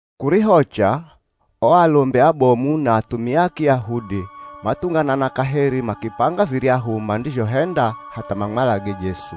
Kurihocha, o alombi abomu na athumia a Kiyahudi mathunganana kaheri makipanga viryahu mandizhohenda hatha mamwalage Jesu.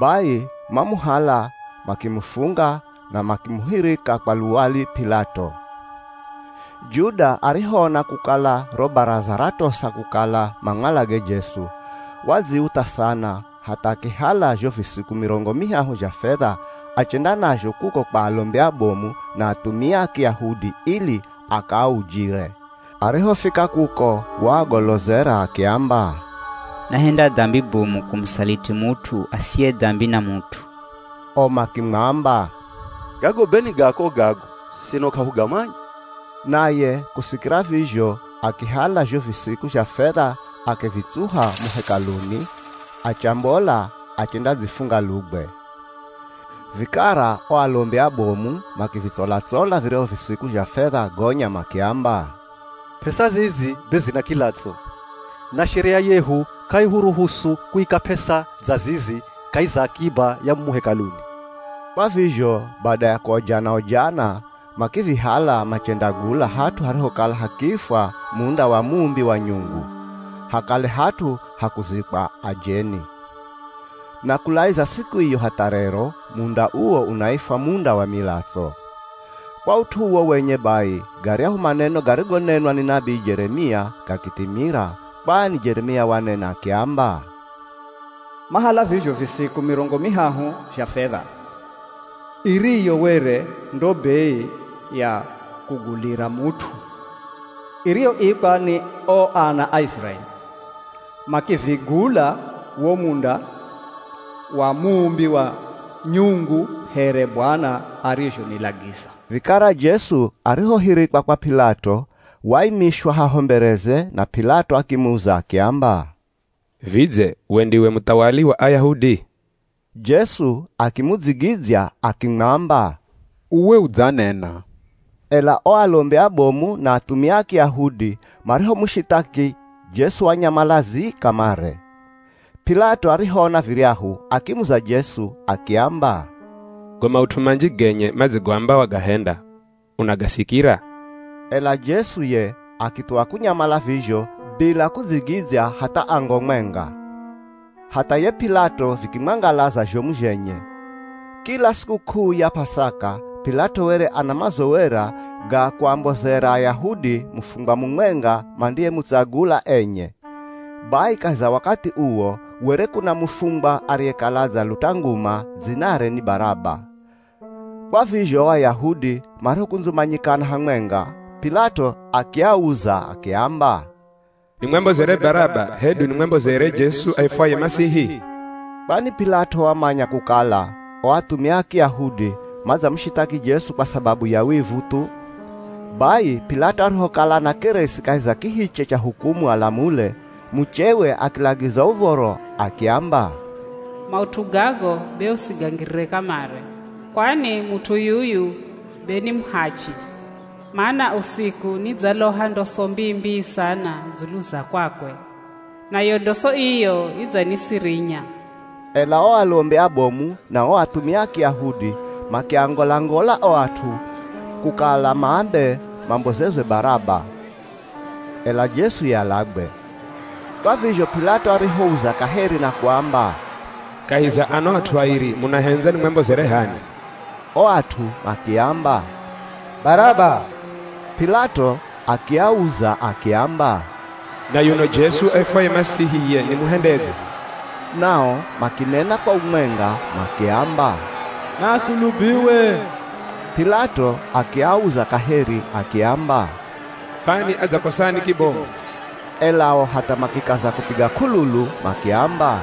Bai mamuhala makimufunga, na makimuhirika kwa luwali P'ilato. Juda arihoona kukala ro Baraza ratosa kukala mamwalage Jesu, wadziutha sana, hatha akihala zho visiku mirongo mihahu zha fedha achenda nazho kuko kwa alombi abomu na athumia a Kiyahudi ili akaaujire. Arihofika kuko waagololeza akiamba, “Nahenda dambi bomu kumusaliti mut'u asiye dambi na mut'u.” O makimwamba, “Gago be ni gako gago, sino k'ahugamanya.” Naye kusikira vizho, akihala zho visiku zha fedha akivitsuha mo Hekaluni, achambola achendadzifunga lugwe. Vikara o alombi abomu makivitsola-tsola viryahu visiku zha fedha gonya makiamba, “P'esa zizi be zina kilatso, na Sheria yehu k'aihuruhusu kuika p'esa dza zizi kahi za akiba ya mumu Hekaluni.” Kwa vizho bada ya kuojana-ojana makivihala machendagula hat'u harihokala hakiifwa Munda wa Muumbi wa Nyungu, hakale hat'u ha kuzikwa ajeni. Na kulaiza siku iyo hatha rero munda uwo unaifwa Munda wa Milatso. Kwa ut'u uwo wenye bai, garyahu maneno garigonenwa ni nabii Jeremia gakithimira. Kwani Jeremia wanena akiamba, “Mahala vizho visiku mirongo mihahu zha fedha, iriyo were ndo bei ya kugulira mut'u iriyoikwa ni o ana a Iziraeli, makivigula wo Munda wa Muumbi wa Nyungu here Bwana arizhonilagiza.” Vikara Jesu arihohirikwa kwa P'ilato, waimishwa haho mbereze na P'ilato akimuza akiamba, “Vidze we ndiwe muthawali wa Ayahudi?” Jesu akimudzigidzya akimwamba, “Uwe udzanena.” Ela o alombi abomu na athumia a Kiyahudi marihomushithaki, Jesu wanyamala zii kamare. P'ilato arihoona viryahu, akimuza Jesu akiamba, “Go maut'u manji genye madzigoamba wagahenda unagasikira?” Ela Jesu ye akithuwa kunyamala vizho bila kudzigidzya hatha ango mwenga, hatha ye P'ilato vikimwangalaza zhomu zhenye. Kila sikuk'uu ya P'asaka, P'ilato were ana mazowera ga kuambozera Ayahudi mufungwa mumwenga mandiyemutsagula enye. Bai kahi za wakathi uwo, kwere kuna mufungwa ariyekala adzaluta nguma, dzinare ni Baraba. Kwa vizho o Ayahudi marihokundzumanyikana hamwenga, P'ilato akiauza akiamba, “Nimwambozere Baraba hedu nimwambozere Jesu aifwaye Masihi?” Kwani P'ilato wamanya kukala o athumia a Kiyahudi madzamushithaki Jesu kwa sababu ya wivu thu. Bai P'ilato arihokala anakeresi kahi za kihiche cha hukumu alamule, muchewe akilagiza uv̱oro akiamba, “Maut'u gago be usigangirire kamare, kwani mut'u yuyu be ni muhachi. Mana usiku nidzaloha ndoso mbii-mbii sana dzulu za kwakwe. Nayo ndoso iyo idzanisirinya.” Ela o alombi abomu na o athumia a Kiyahudi makiangola-ngola o at'u kukala maambe mambozerwe Baraba, ela Jesu ye alagwe. Kwa vizho P'ilato arihouza kaheri na kuamba, “Kahi za ano at'u airi munahendza nimwambozere h'ani?” O at'u makiamba, “Baraba.” P'ilato akiauza akiamba, “Na yuno Jesu aifwaye Masihi ye nimuhendedze?” Nao makinena kwa umwenga makiamba, “Naasulubiwe!” P'ilato akiauza kaheri akiamba, “Kwani adzakosani kibomu?” Ela o hatha makikaza kupiga k'ululu makiamba,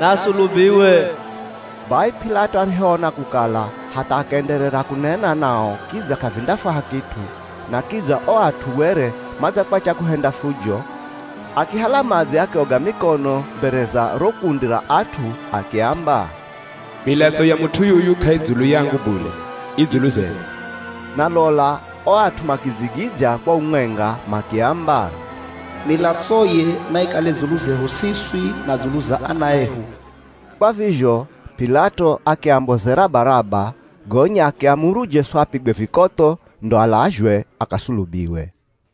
“Naasulubiwe!” Bai P'ilato arihoona kukala hatha akaenderera kunena nao kidza k'avindafwaha kit'u na kidza o at'u were madzakwacha kuhenda fujo, akihala madzi akioga mikono mbere za ro kundi ra at'u, akiamba, “Milatso ya mut'u yuyu k'aidzulu yangu bule, i dzulu zenu.” Na lola o at'u makidzigidzya kwa umwenga makiamba, “Milatsoye naikale dzulu zehu siswi na dzulu za ana ehu.” Kwa vizho P'ilato akiambozera Baraba, gonya akiamuru Jesu apigwe vikotho, ndo alazhwe akasulubiwe.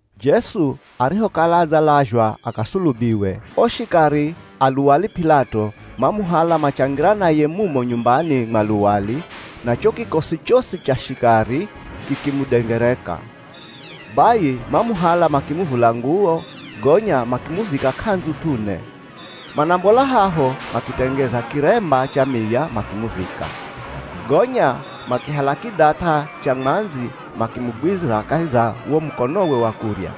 Jesu arihokala adzalazhwa akasulubiwe, o shikari a luwali P'ilato mamuhala machangira naye mumo nyumbani mwa luwali, na cho kikosi chosi cha shikari kikimudengereka. Bai mamuhala makimuvula nguwo, gonya makimuvika k'andzu th'une. Manambola haho makitengeza kiremba cha miya makimuvika. Gonya makihala kidhath'a cha mwandzi makimugwiza kahi za wo mukonowe wa kurya.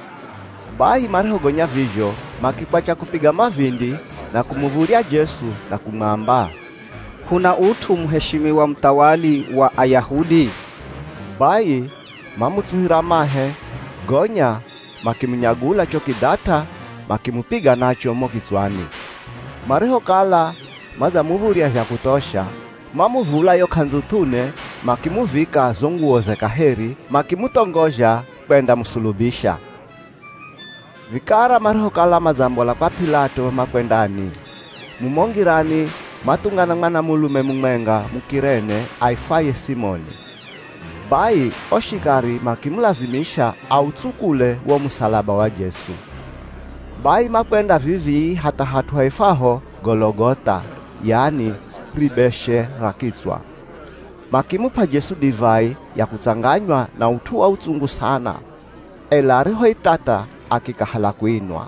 Bai marihogonya vizho makikwacha kupiga mavindi na kumuv̱udhya Jesu na kumwamba, “K'una ut'u muheshimiwa muthawali wa Ayahudi?” Bai mamutsuhira mahe, gonya makimunyagula cho kidhath'a makimupiga nacho mo kitswani. Marihokala madzamuv̱udhya zha kuthosha, mamuvula yo k'andzu th'une, makimuvika zo nguwoze kaheri, makimuthongozha kwendamusulubisha. Vikara marihokala madzambola kwa P'ilato makwendani, mumo ngirani mathungana mwanamulume mumwenga Muk'irene aifwaye Simoni. Bai o shikari makimulazimisha autsukule wo musalaba wa Jesu. Bai makwenda vivii hatha hat'u haifwaho Gologoth'a, yani Ribeshe ra Kitswa. Makimup'a Jesu divai ya kutsanganywa na ut'u wa utsungu sana, ela arihoithatha akikahala kuinwa.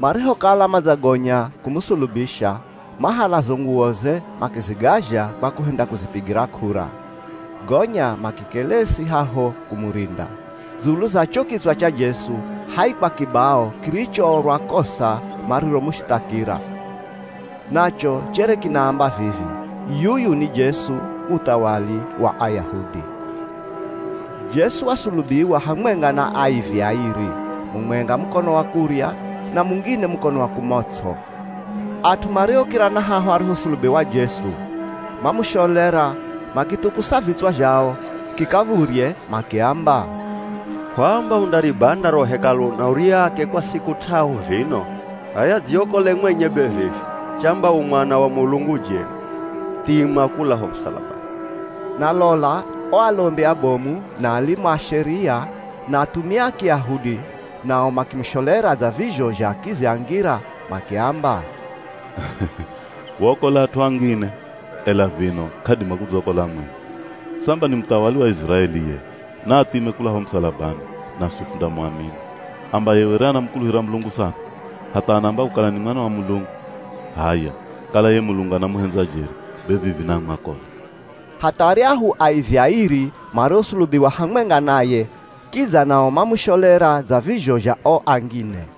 Marihokala madzagonya kumusulubisha, mahala zo nguwoze makizigazha kwa kuhenda kuzipigira k'ura. Gonya makikelesi haho kumurinda. Dzulu za cho kitswa cha Jesu haikwa kibao kirichoorwa kosa mariromushithakira. Nacho chere kinaamba vivi: Yuyu Ni Jesu, Muthawali Wa Ayahudi. Jesu wasulubiwa hamwenga na aivi airi. Mumwenga mukono wa kurya, na mungine mukono wa kumots'o. At'u mariokira na haho arihosulubiwa Jesu, mamusholera, makithukusa vitswa zhao kikav̱udhye, makiamba, “Kw'aamba undaribanda ro Hekalu na uriake kwa siku t'ahu vino? H'aya dziokole mwenye be vivi. Chamba u Mwana wa Mulungu jeri, thima kula ho musalabani.” Na lola o alombi abomu, na alimu a Sheria, na athumia a Kiyahudi nao makimusholera dza vizho zha akizi a ngira. Makiamba, “Waokola at'u angine, ela vino k'adima kudzakola mwenye. Samba ni muthawali wa Iziraeli ye, naathime kula ho musalabani, naswi fundamuamini. Amba ye were anamukuluhira Mulungu sana; hatha anaamba kukala ni Mwana wa Mulungu. H'aya kala ye Mulungu anamuhendza jeri, be vivi naamwakole.” Hatha aryahu aivi airi mariosulubiwa hamwenga naye kidza nao mamusholera dza vizho zha o angine.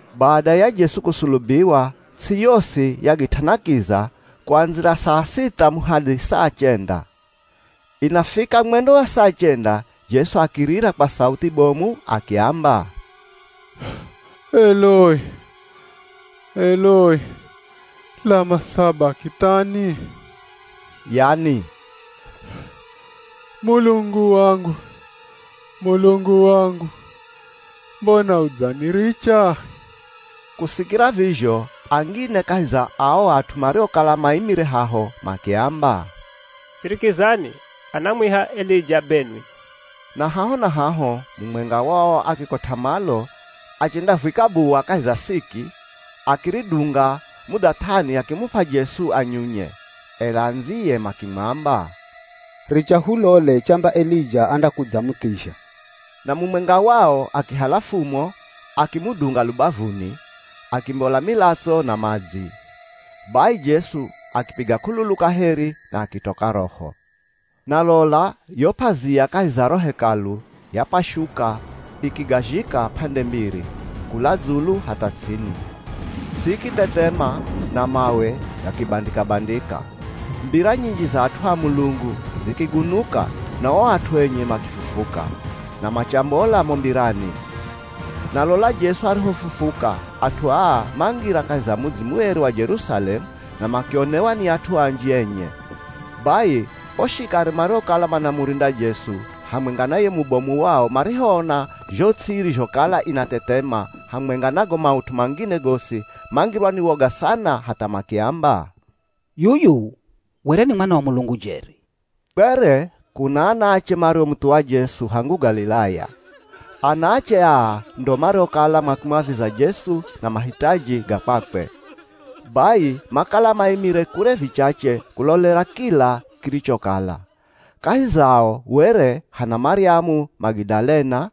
Bada ya Jesu kusulubiwa, ts'i yosi yagit'ana kiza kuandzira saa sitha muhadhi saa chenda. Inafika mwendo wa saa chenda Jesu akirira kwa sauthi bomu akiamba, “Eloi Eloi, lama sabakithani?” Yani, “Mulungu wangu, Mulungu wangu, mbona udzaniricha?” Kusikira vizho, angine kahi za ao at'u mariokala maimire haho makiamba, “Sirikizani, anamwiha Elija benwi!” Na haho na haho, mumwenga wao akikot'a malo achendavwika buwa kahi za siki, akiridunga mudhath'ani akimup'a Jesu anyunye. Ela andziye makimwamba, “Richa hulole chamba Elija andakudzamuthizha.” [Na mumwenga wao akihala fumo akimudunga lubavuni, akimbola milatso na madzi.] Bai Jesu akipiga k'ululu kaheri na akitoka roho. Na lola yo p'azia kahi za ro Hekalu yapashuka ikigazhika p'ande mbiri, kula dzulu hatha ts'ini. Ts'i ikithethema na mawe gakibandika-bandika. Mbira nyinji za at'u a Mulungu zikigunuka na o at'u enye makifufuka, na machambola mo mbirani. Na lola Jesu arihofufuka, at'u aa mangira kahi za mudzi mueri wa Jerusalemu na makionewa ni at'u anji enye. Bai o shikari mariokala manamurinda Jesu, hamwenga na ye mubomu wao marihoona zho ts'i irizhokala inathethema, hamwenga na go maut'u mangine gosi, mangirwa ni woga sana hatha makiamba, “Yuyu were ni Mwana wa Mulungu jeri.” Kwere kuna anaache mariomuthuwa Jesu hangu Galilaya. Anaache aa ndo mariokala makimwaviza Jesu na mahitaji ga kwakwe. Bai makala maimire kure vichache kulolera kila kirichokala. Kahi zao were hana Maryamu Magidalena,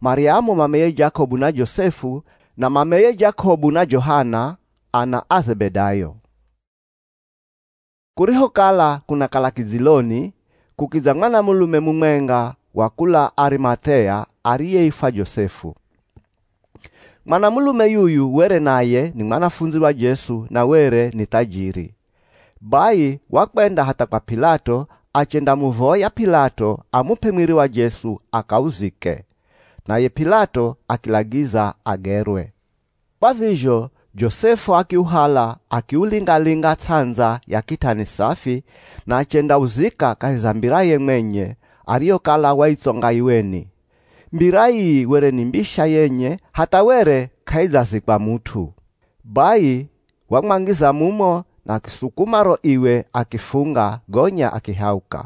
Maryamu mameye Jakobu na Josefu, na mameye Jakobu na Johana, ana a Zebedayo. Kurihokala kunakala kidziloni, kukidza mwanamulume mumwenga wa kula Arimath'ea ariyeifwa Josefu. Mwanamulume yuyu were naye ni mwanafundzi wa Jesu na were ni thajiri. Bai wakwenda hatha kwa P'ilato achendamuvoya P'ilato amup'e mwiri wa Jesu akauzike. Naye P'ilato akilagiza agerwe. Kwa vizho Josefu akiuhala akiulinga-linga ts'andza ya kitani safi, na achendauzika kahi za mbiraye mwenye, ariyokala waitsonga iweni. Mbira ii were ni mbisha yenye hatha were k'aidzazikwa mut'u. Bai wamwangiza mumo na akisukuma ro iwe akifunga, gonya akihauka.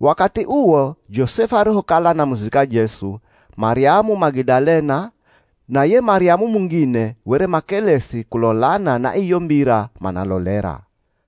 Wakathi uwo Josefu arihokala anamuzika Jesu, Maryamu Magidalena na ye Maryamu mungine were makelesi kulolana na iyo mbira manalolera.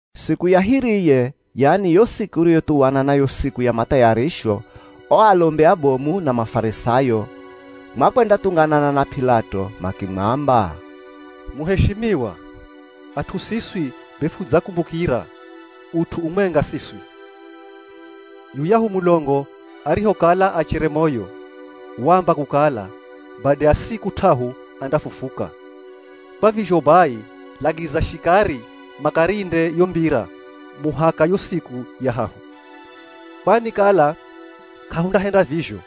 Siku ya hiriye, yani yo siku iriyothuwana na yo Siku ya Mathayarisho, o alombi abomu na Mafarisayo makwendathunganana na P'ilato. Makimwamba, “Muheshimiwa, at'u siswi be fudzakumbukira ut'u umwenga siswi. Yuyahu mulongo arihokala achere moyo, waamba kukala, bada ya siku t'ahu andafufuka. Kwa vizho bai, lagiza shikari makarinde yo mbira muhaka yo siku ya hahu. Kwani kala k'ahundahenda vizho,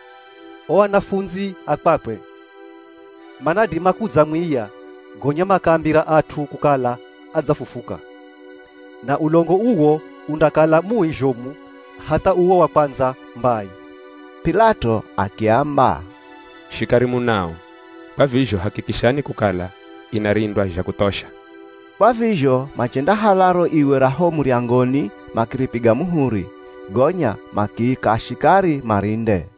o anafundzi a kwakwe manadima kudzamwiya gonya makaambira at'u kukala adzafufuka. Na ulongo uwo undakala mui zhomu hatha uwo wa kwandza mbai.” P'ilato akiamba, “Shikari munao, kwa vizho hakikishani kukala inarindwa zha kuthosha.” Kwa vizho machendahala ro iwe ra ho muryangoni makiripiga muhuri. Gonya makiika shikari marinde.